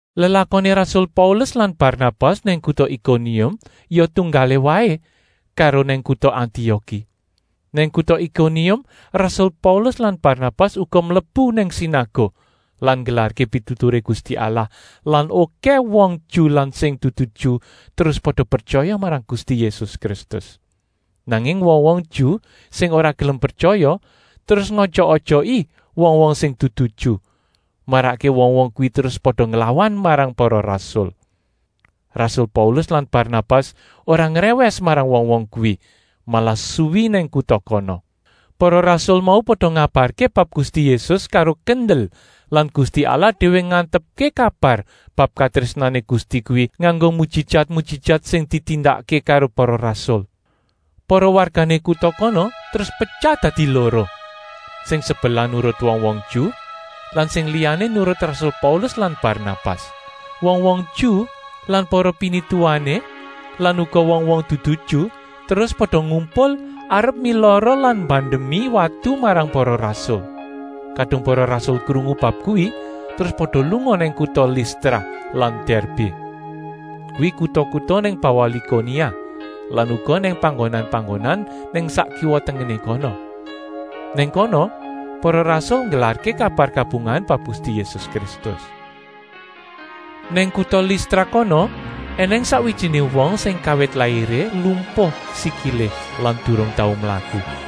Lelakoné rasul Paulus lan Barnabas nang kuta Ikonium ya tunggalé waé karo nang kuta Antioki. Nang kuta Ikonium rasul Paulus lan Barnabas uga mlebu nang sinaguk lan nggelarké pituturé Gusti Allah lan okèh wong Ju lan sing dudu Ju terus pada pretyaya marang Gusti Yésus Kristus. Nanging wong-wong Ju sing ora gelem pretyaya terus ngojok-ojoki wong-wong sing dudu Ju, marakké wong-wong kuwi terus pada nglawan marang para rasul. Rasul Paulus lan Barnabas ora ngrèwès marang wong-wong kuwi, malah suwi nang kuta kono. Para rasul mau pada ngabarké bab Gusti Yésus karo kendel lan Gusti Allah déwé ngantepké kabar bab katrésnané Gusti kuwi nganggo mujijat-mujijat sing ditindakké karo para rasul. Para wargané kuta kono terus petyah dadi loro: sing sebelah nurut wong-wong Ju lan sing liyané nurut rasul Paulus lan Barnabas. Wong-wong Ju lan para pinituwané lan uga wong-wong dudu Ju terus pada ngumpul arep milara lan mbandemi watu marang para rasul. Kadung para rasul krungu bab kuwi terus pada lunga nang kuta Listra lan Dèrbé, kuwi kuta-kuta nang bawah Likonia lan uga nang panggonan-panggonan nang sak kiwa-tengené kono. Nang kono para rasul nggelarké kabar kabungahan bab Gusti Yésus Kristus. Nang kuta Listra kono ènèng sakwijiné wong sing kawit lairé lumpuh sikilé lan durung tau mlaku.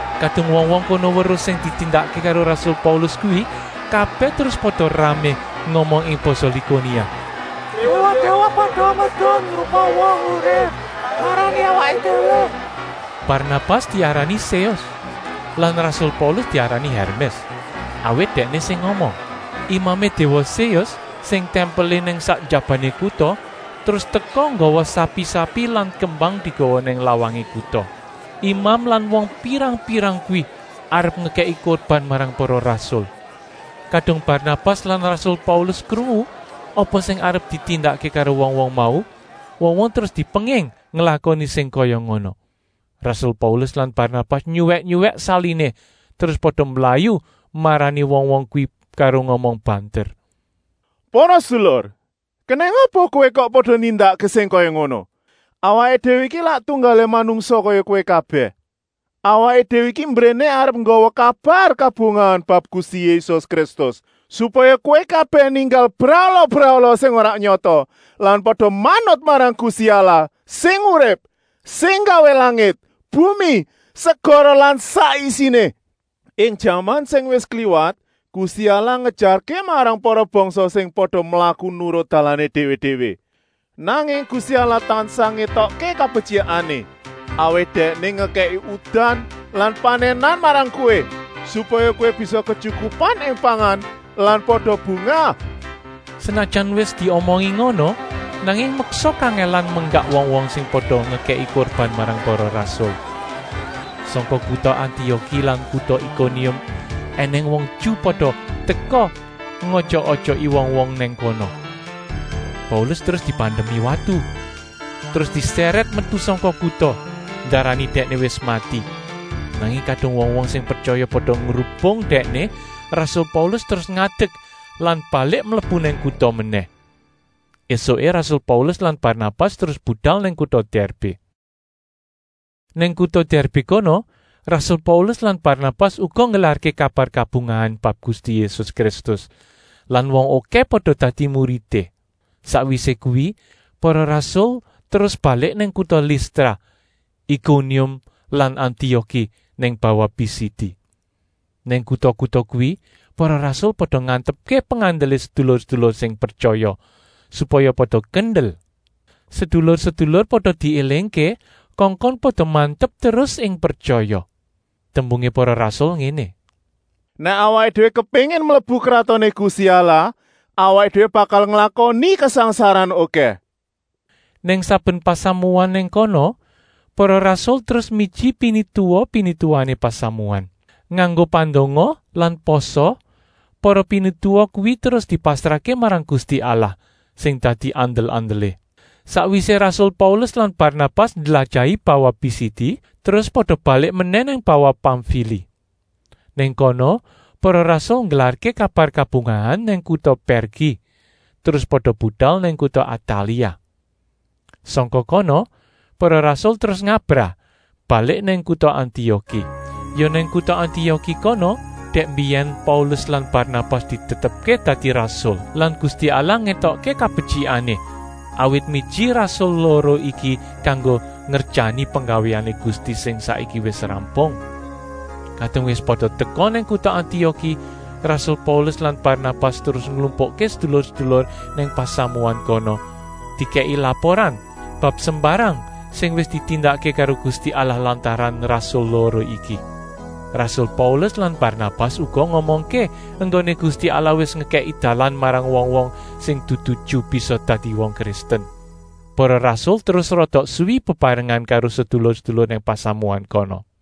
Kadung wong-wong kono weruh sing ditindakké karo rasul Paulus kuwi, kabèh terus pada ramé ngomong ing basa Likonia: “Déwa-déwa pada medun rupa wong urip marani awaké déwé.” Barnabas diarani Séus lan rasul Paulus diarani Hèrmès, awit dèkné sing ngomong. Imamé déwa Séus, sing tèmpelé nang sak njabané kuta, terus teka nggawa sapi-sapi lan kembang digawa nang lawangé kuta. Imam lan wong pirang-pirang kuwi arep ngekèki kurban marang para rasul. Kadung Barnabas lan rasul Paulus krungu apa sing arep ditindakké karo wong-wong mau, wong-wong terus dipenging nglakoni sing kaya ngono. Rasul Paulus lan Barnabas nyuwèk-nyuwèk saliné, terus pada mblayu marani wong-wong kuwi karo ngomong banter: “Para sedulur, kenèng apa kowé kok pada nindakké sing kaya ngono. Awaké déwé iki lak tunggalé manungsa kaya kowé kabèh. Awaké déwé iki mbréné arep nggawa kabar kabungahan bab Gusti Yésus Kristus, supaya kowé kabèh ninggal brahala-brahala sing ora nyata lan pada manut marang Gusti Allah sing urip, sing nggawé langit, bumi, segara lan sak isiné. Ing jaman sing wis kliwat Gusti Allah ngejarké marang para bangsa pada mlaku nurut dalané déwé-déwé. Nanging Gusti Allah tansah ngétokké kabetyikané, awit Dèkné ngekèki udan lan panènan marang kowé, supaya kowé bisa ketyukupan ing pangan lan pada bungah.” Senajan wis diomongi ngono, nanging meksa kangèlan menggak wong-wong sing pada ngekèki kurban marang para rasul. Sangka kuta Antioki lan kuta Ikonium ènèng wong Ju pada teka ngojok-ojoki wong-wong nang kono. Paulus terus dibandemi watu, terus disèrèt metu sangka kuta, ndarani dèkné wis mati. Nanging kadung wong-wong sing pretyaya pada ngrubung dèkné, rasul Paulus terus ngadek lan balik mlebu nang kuta menèh. Esuké rasul Paulus lan Barnabas terus budal nang kuta Dèrbé. Nang kuta Dèrbé kono rasul Paulus lan Barnabas uga nggelarké kabar kabungahan bab Gusti Yésus Kristus lan wong okèh pada dadi muridé. Sakwisé kuwi para rasul terus balik nang kuta Listra, Ikonium lan Antioki nang bawah Pisidi. Nang kuta-kuta kuwi para rasul pada ngantepké pengandelé sedulur-sedulur sing pretyaya, supaya pada kendel. Sedulur-sedulur pada diélingké kongkon pada mantep terus ing pretyaya. Tembungé para rasul ngéné: “Nèk awaké déwé kepéngin mlebu Kratoné Gusti Allah, awaké déwé bakal nglakoni kasangsaran okèh.” Nang saben pasamuan nang kono para rasul terus miji pinituwa-pinituwané pasamuan. Nganggo pandonga lan pasa para pinituwa kuwi terus dipasrahké marang Gusti Allah, sing dadi andel-andelé. Sakwisé rasul Paulus lan Barnabas ndlajahi bawah Pisidi, terus pada balik menèh nang bawah Pamfili. Nang kono para rasul nggelarké kabar kabungahan nang kuta Pèrgi, terus pada budal nang kuta Atalia. Sangka kono para rasul terus ngabrah, balik nang kuta Antioki. Ya nang kuta Antioki kono dèk mbiyèn Paulus lan Barnabas ditetepké dadi rasul lan Gusti Allah ngétokké kabetyikané, awit miji rasul loro iki kanggo ngerjani penggawéané Gusti sing saiki wis rampung. Kadung wis pada teka nang kuta Antioki rasul Paulus lan Barnabas terus nglumpukké sedulur-sedulur nang pasamuan kono, dikèki laporan bab sembarang sing wis ditindakké karo Gusti Allah lantaran rasul loro iki. Rasul Paulus lan Barnabas uga ngomongké enggoné Gusti Allah wis ngekèki dalan marang wong-wong sing dudu Ju bisa dadi wong Kristen. Para rasul terus rada suwi bebarengan karo sedulur-sedulur nang pasamuan kono.